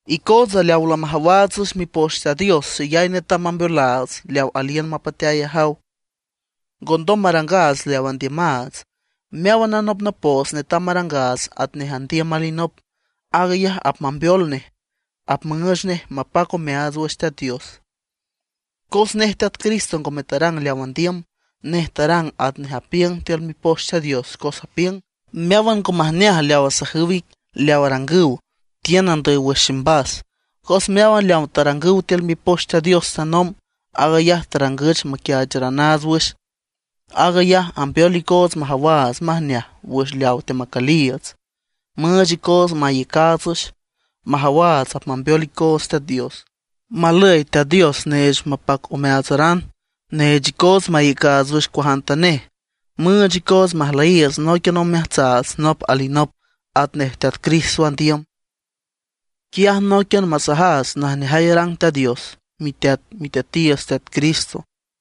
Icootsa leaw lamajawaats wüx Mipoch Teat Dios xeyay netam mambeolaats leaw aliün mapateay ajaw, ngondom marangaats leaw andiümaats. Meáwan anopnopoots netam marangaats atnej andiüm alinop; aag ayaj apmambeol nej apmüüch nej mapac omeaats wüx Teat Dios. Cos nej Teat Cristo ngome tarang leaw andiüm; nej tarang atnej apiüng tiül Mipoch Teat Dios, cos apiüng: “Meáwan ngo majneaj leaw asajüw ic, leaw arangüw, tiün andüy wüx ximbas”. Cos meáwan leaw tarangüch tiül Mipoch Teat Dios tanomb, aag ayaj tarangüch maquiaacheranaats wüx. Aag ayaj ambeol icoots majawaats majneaj wüx leaw teamacüliiüts, müüch icoots maiücaats wüx, majawaats apmambeol icoots Teat Dios. Malüy Teat Dios neech mapac omeaatsaran, neech icoots maiücaats wüx cuajantanej, müüch icoots majlüyiiüts nóiquian omeajtsaats nop alinop atnej Teat Cristo andiüm. Quiaj nóiquian masajaats najneajay arang Teat Dios miteat Miteatiiüts Teat Cristo.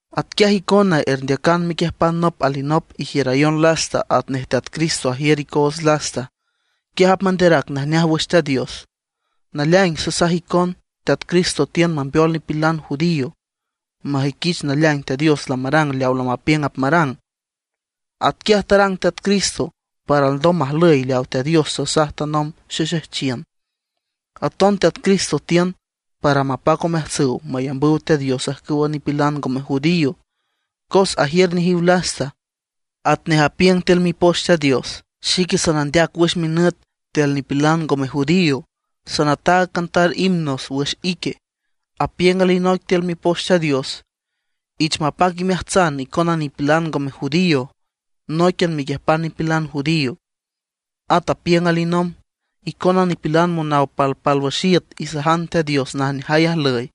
Atquiaj icona erndeacan mequiüjpan nop alinop, ijiürayon lasta atnej Teat Cristo ajiür icoots lasta. Quiaj apmanderac najneaj wüx Teat Dios. Naleaing sasaj icon, Teat Cristo tiün mambeol nipilan judío majüiquich naleaing Teat Dios lamarang leaw lamapiüng apmarang. Atquiaj tarang Teat Cristo para alndom majlüy leaw Teat Dios tasaj tanomb xexejchiün. Aton Teat Cristo tiün para mapac omeajtsüw mayambüw Teat Dios ajcüwa nipilan ngome judío, cos ajiür nejiw lasta. Atnej apiüng tiül Mipoch Teat Dios: Xique sanandeac wüx minüt tiül nipilan ngome judío, sanataag cantar himnos wüx ique. Apiüng alinoic tiül Mipoch Teat Dios: Ich mapac imeajtsan icona nipilan ngome judío nóiquian mequiüjpan nipilan judío. At apiüng alinomb: Icona nipilan monaw palpálwüx iüt isajan Teat Dios najneajay ajlüy.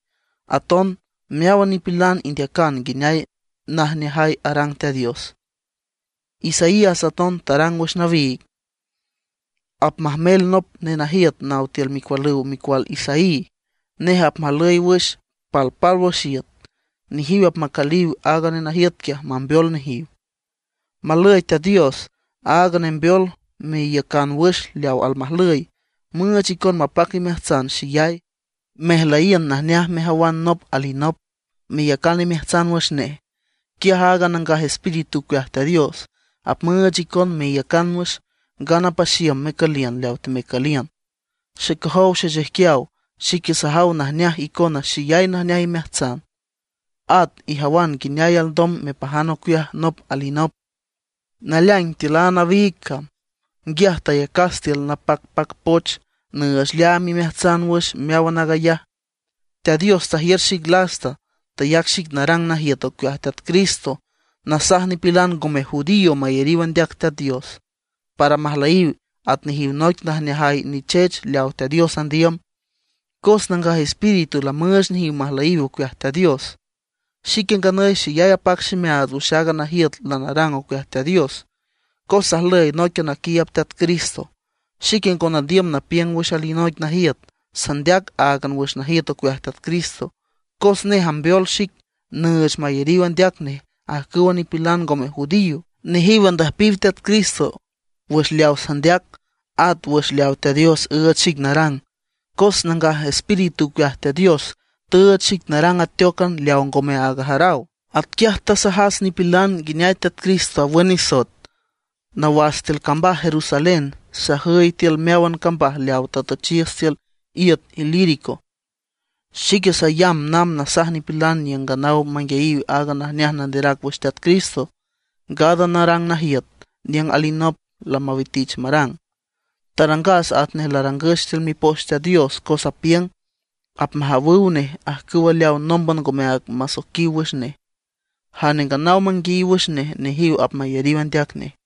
Aton meáwan nipilan indeacan nguineay najneajay arang Teat Dios. Isaías aton tarang wüx nawiig: Apmajmel nop nenajiüt naw tiül micualüw micual Isaí, nej apmajlüy wüx palpálwüx iüt; nejiw apmacüliw aaga nenajiüt quiaj mambeol nejiw. Malüy Teat Dios, aaga nembeol meiücan wüx leaw almajlüy, müüch icon mapac imeajtsan xeyay, mejlüyiün najneaj mejawan nop alinop, meyacan imeajtsan wüx nej. Quiaj aaga Nangaj Espíritu ocueaj Teat Dios apmüüch icon meiücan wüx, ngana paxiüm mecüliün leaw temecüliün. Xecojow xechijquiaw, xique sajaw majneaj icona xeyay najneaj imeajtsan, at ijawan nguineay alndom mepajan ocueaj nop alinop. Naleaing tiül a nawiig cam nguiaj tayacas tiül napacpac poch nüüch leaam imeajtsan wüx meáwan aag ayaj. Teat Dios tajiür xic lasta; tayac xic narang najiüt ocueaj Teat Cristo, nasaj nipilan ngome judío mayariw andeac Teat Dios, para majlüyiw at nejiw noic najneajay nichech leawa Teat Dios andiüm. Cos Nangaj Espíritu lamüüch nejiw majlüyiw ocueaj Teat Dios. Xique nganüy xeyay apac ximeaats wüx aaga najiüt lanarang ocueaj Teat Dios, cos sajlüy nóiquian naquiiüb Teat Cristo. Xique ngo nandiüm napiüng wüx alinoic najiüt, sandeac áagan wüx najiüt ocueaj Teat Cristo, cos nej ambeol xic nüüch mayariw andeac nej ajcüwa nipilan ngome judío. Nejiw andüjpiw Teat Cristo wüx leaw sandeac, at wüx leaw Teat Dios üüch xic narang. Cos Nangaj Espíritu ocueaj Teat Dios tüüch xic narang ateócan leaw ngome aag ajaraw. Atquiaj tasajas nipilan nguineay Teat Cristo awün nisoet, nawas tiül cambaj Jerusalén sajüy tiül meáwan cambaj leaw tatüchiüs tiül iüt Ilírico. Xique sayamb namb nasaj nipilan niüng nganaw manguiayiw aaga najneaj nanderac wüx Teat Cristo, ngana narang najiüt niüng alinop lamawitich marang. Tarangas atnej larangüch tiül Mipoch Teat Dios, cos apiüng: Apmajawüw nej ajcüwa leawa nómban ngome áag masoiquiw wüx nej, jane nganaw manguiayiw wüx nej, nejiw apmayariw andeac nej.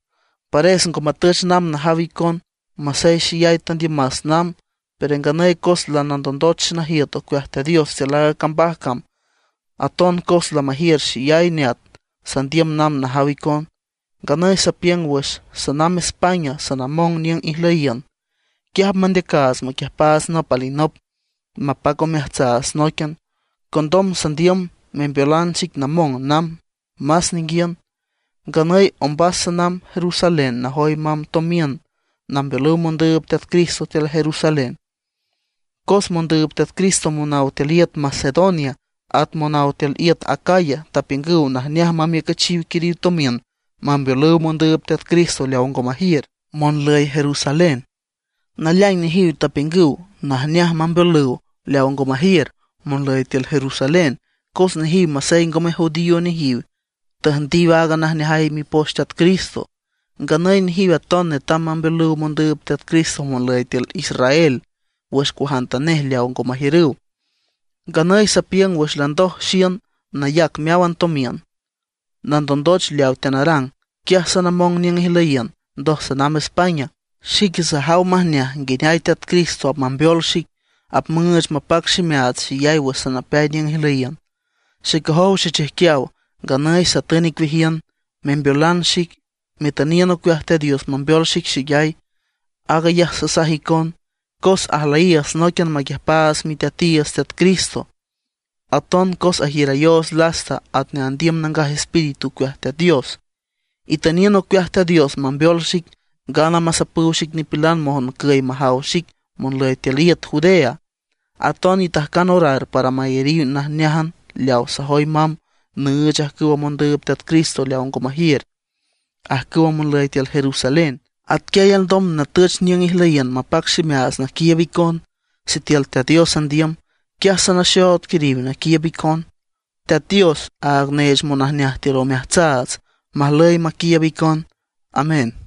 Pares ngo matüch namb najaw icon, masey xeyay tandiümas namb. Pero nganüy cos lanandondoch xenajiüt ocueaj Teat Dios tiül aaga cambaj cam, aton cos lamajiür xeyay neat sandiüm namb najaw icon; nganüy sapiüng wüx sanamb España sanamong niüng ijlüyiün. Quiaj apmandeacaats maquiüjpaats nop alinop, mapac omeajtsaats nóiquian. Condom sandiüm membeolan xic namong namb más ninguiün. Nganüy ombas sanamb Jerusalén najoy mamb tomiün nambeolüw mondüüb Teat Cristo tiül Jerusalén. Cos mondüüb Teat Cristo monaw tiül iüt Macedonia, at monaw tiül iüt Acaya tapiüngüw najneaj mamiücüchiw quiriw tomiün mambeolüw mondüüb Teat Cristo leaw ngo majiür, monlüy Jerusalén. Naleaing nejiw tapiüngüw najneaj mambeolüw leaw ngo majiür, monlüy tiül Jerusalén, cos nejiw masey ngome judío nejiw, tüjndiw aaga najneajay mipoch Teat Cristo. Nganüy nejiw aton netam mambeolüw mondüüb Teat Cristo monlüy tiül Israel wüx cuajantanej leaw ngo majiürüw. Nganüy sapiüng wüx landoj xiün nayac meáwan tomiün, nandondoch leaw teanarang, quiaj sanamong niüng ijlüyiün, ndoj sanamb España. Xique sajaw majneaj nguineay Teat Cristo apmambeol xic, müüch mapac ximeaats xeyay wüx sanapeay niüng ijlüyiün. Xecojow xechijquiaw, nganüy satün icueajiün membeolan xic, metüniün ocueaj Teat Dios mambeol xic xeyay. Aag ayaj sasaj icon, cos ajlüyiiüts nóiquian maquiüjpaats Miteatiiüts Teat Cristo, aton cos ajiürayoots lasta atnej andiüm Nangaj Espíritu ocueaj Teat Dios. Itüniün ocueaj Teat Dios mambeol xic, ngana masapüw xic nipilan moncüy majaw xic monlüy tiül iüt Judea. Aton itajcan orar para mayariw najneájan leaw sajoy mamb nüüch ajcüwa mondüüb Teat Cristo leaw ngo majiür, ajcüwa monlüy tiül Jerusalén. Atquiay alndom natüch niüng ijlüyiün mapac ximeaats naquiiüb icon, sitiül Teat Dios andiüm. Quiaj sanaxood quiriw naquiiüb icon. Teat Dios, aaga neech monajneaj tiül omeajtsaats majlüy maquiiüb icon. Amén.